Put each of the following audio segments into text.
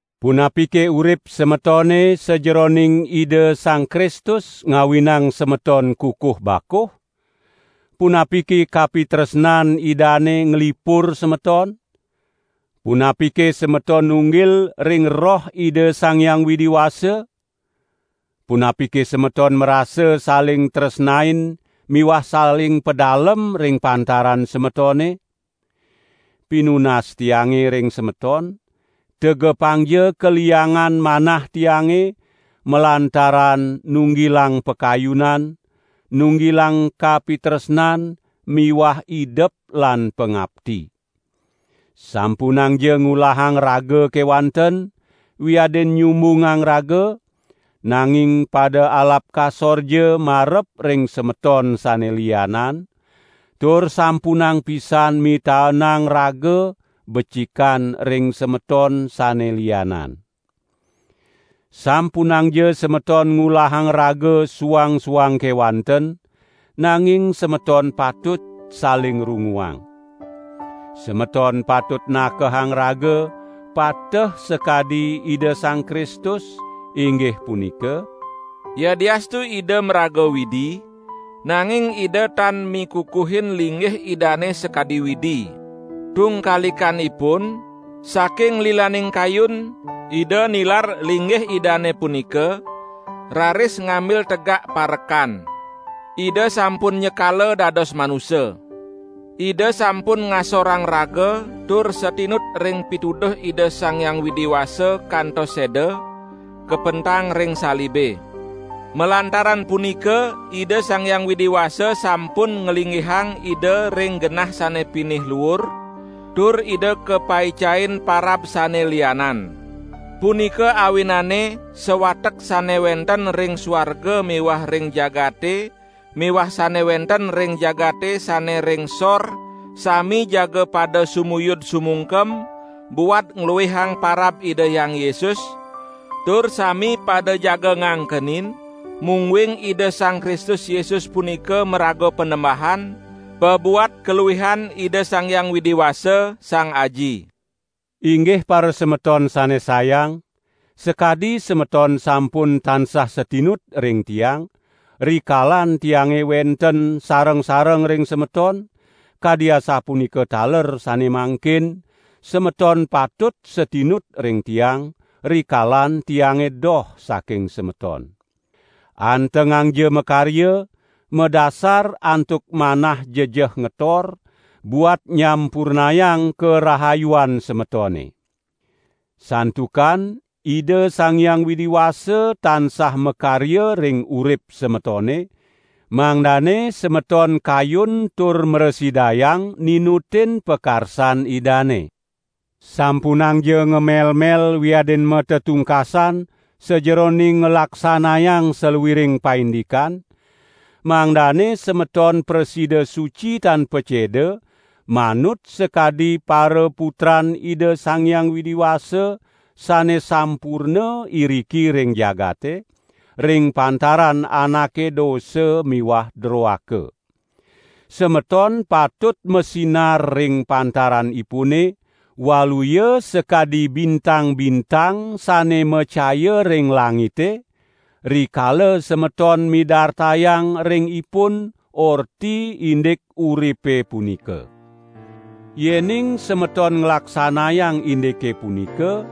Punapike urip semetone sajeroning Ida Sang Kristus ngawinang semeton kukuh bakuh? Punapike kapitresnan Idane nglipur semeton? Punapike semeton nunggil ring Roh Ida Sang Hyang Widi Wasa? Punapike semeton marasa saling tresnain miwah saling padalem ring pantaran semetone? Pinunas tiange ring semeton, tegepangja kaliangan manah tiange, malantaran nunggilang pakayunan, nunggilang kapitresnan miwah idep lan pangapti. Sampunangja ngulahang raga kewanten, wiadin nyumbungang raga, nanging pada alap kasorja marep ring semeton sane lianan, tur sampunang pisan mitaenang raga becikan ring semeton sane lianan. Sampunangja semeton ngulahang raga suang-suang kewanten, nanging semeton patut saling runguang. Semeton patut nakehang raga pateh sakadi Ida Sang Kristus, inggih punika: Yadiastu Ida maraga Widi, nanging Ida tan mikukuhin linggih Idane sakadi Widi. Tungkalikanipun, saking lilaning kayun, Ida nilar linggih Idane punika, raris ngambil tegak parekan. Ida sampun nyekala dados manusa. Ida sampun ngasorang raga tur satinut ring pituduh Ida Sang Hyang Widi Wasa kantos seda, kapentang ring salibe. Malantaran punika Ida Sang Hyang Widi Wasa sampun nglinggihang Ida ring genah sane pinih luur, tur Ida kapaicain parab sane lianan. Punika awinane sawatek sane wenten ring suarga miwah ring jagate miwah sane wenten ring jagate sane ring sor sami jaga pada sumuyud sumungkem, buat ngluihang parab Ida Hyang Yesus, tur sami pada jaga ngangkenin, mungguing Ida Sang Kristus Yesus punika maraga Panembahan, pabuat kaluihan Ida Sang Hyang Widi Wasa, Sang Aji. Inggih parasemeton sane sayang, sakadi semeton sampun tansah satinut ring tiang, rikalan tiange wenten sareng-sareng ring semeton, kadi asapunika taler sane mangkin, semeton patut satinut ring tiang, rikalan tiange doh saking semeton. Antengangja makarya, madasar antuk manah jejeh ngetor, buat nyampurnayang karahayuan semetone. Santukan Ida Sang Hyang Widi Wasa tansah makarya ring urip semetone, mangdane semeton kayun tur mrasidayang ninutin pakarsan Idane. Sampunangja ngamelmel wiadin matetungkasan sajeroning nglaksanayang saluiring paindikan, mangdane semeton prasida suci tan paceda, manut sakadi paraputran Ida Sang Hyang Widi Wasa sane sampurna iriki ring jagate, ring pantaran anake dosa miwah droaka. Semeton patut masinar ring pantaranipune, waluya sakadi bintang-bintang sane macaya ring langite, rikala semeton midartayang ring ipun Orti indik uripe punika. Yening semeton nglaksanayang indike punika,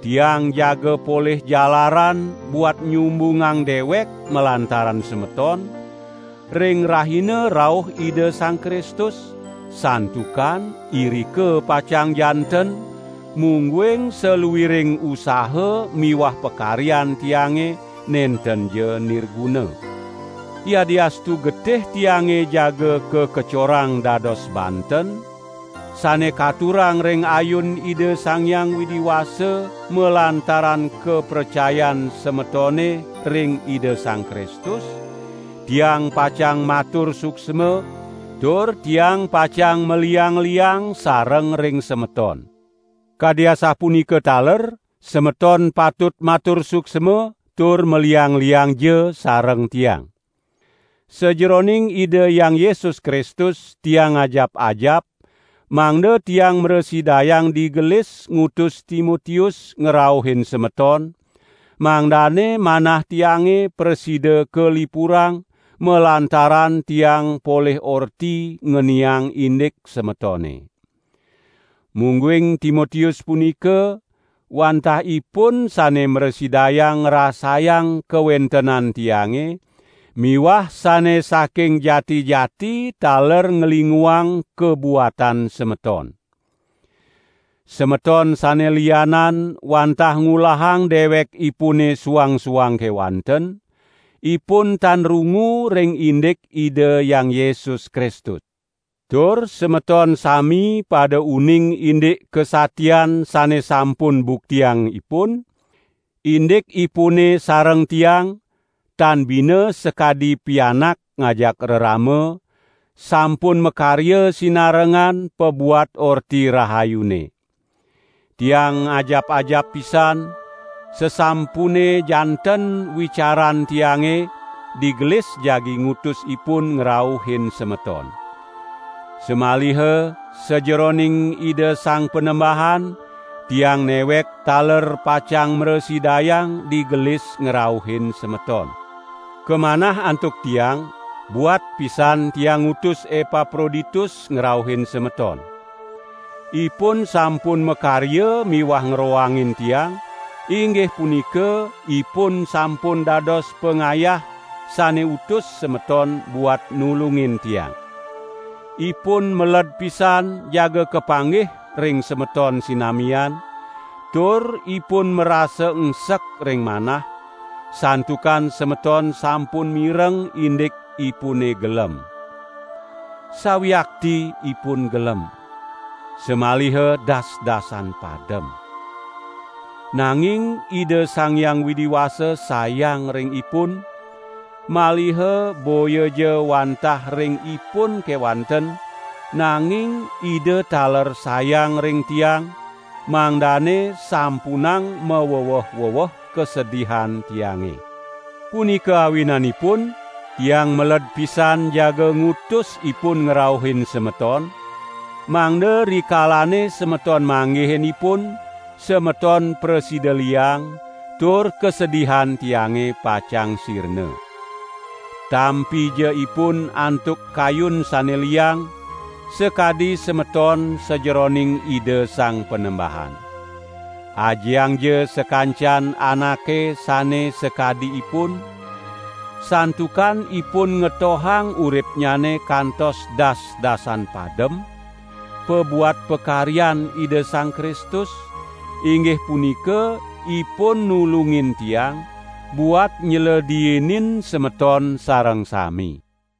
tiang jaga polih jalaran buat nyumbungang dewek malantaran semeton, ring rahina rauh Ida Sang Kristus, santukan irika pacang janten, mungguing saluiring usaha miwah pakaryan tiange nentenja nirguna. Yadiastu getih tiange jaga kakecorang dados banten, sane katurang ring ayun Ida Sang Hyang Widi Wasa malantaran kapracayan semetone ring Ida Sang Kristus, tiang pacang matur suksma, tur tiang pacang maliang-liang sareng ring semeton. Kadi asapunika taler semeton patut matur suksma, tur maliang-liangja sareng tiang. Sajeroning Ida Hyang Yesus Kristus, tiang ngajap-ajap, mangda tiang mrasidayang digelis ngutus Timotius ngrauhin semeton, mangdane manah tiange prasida kalipurang malantaran tiang polih orti ngeniang indik semetone. Mungguing Timotius punika, wantah ipun sane mrasidayang ngrasayang kawentenan tiange miwah sane saking jati-jati taler nglinguang kabuatan semeton. Semeton sane lianan wantah ngulahang dewekipune suang-suang kewanten, ipun tan rungu ring indik Ida Hyang Yesus Kristus. Tur semeton sami pada uning indik kasatian sane sampun buktiang ipun, indikipune sareng tiang, tan bina sakadi pianak ngajak rerama, sampun makarya sinarengan pabuat Orti Rahayune. Tiang ngajap-ajap pisan, sasampune janten wicaran tiange, digelis jagi ngutus ipun ngrauhin semeton. Samaliha sajeroning Ida Sang Panembahan, tiang newek taler pacang mrasidayang digelis ngrauhin semeton. Kamanah antuk tiang, buat pisan tiang ngutus Epaproditus ngrauhin semeton. Ipun sampun makarya miwah ngroangin tiang, inggih punika ipun sampun dados pangayah sane utus semeton buat nulungin tiang. Ipun meled pisan jaga kapanggih ring semeton sinamian, tur ipun marasa engsek ring manah, santukan semeton sampun mireng indik ipune gelem. Sawiakti ipun gelem, samaliha das-dasan padem. Nanging Ida Sang Hyang Widi Wasa sayang ring ipun, maliha boyaja wantah ring ipun kewanten, nanging Ida taler sayang ring tiang, mangdane sampunang maweweh-weweh kasedihan tiange. Punika awinanipun tiang meled pisan jaga ngutus ipun ngrauhin semeton, mangda rikalane semeton manggihin ipun, semeton prasida liang, tur kasedihan tiange pacang sirna. Tampija ipun antuk kayun sane liang, sakadi semeton sajeroning Ida Sang Panembahan. Ajiangja sakancan anake sane sakadi ipun, santukan ipun ngetohang uripnyane kantos dasdasan padem, pabuat pakaryan Ida Sang Kristus, inggih punika ipun nulungin tiang, buat nylediinin semeton sareng sami.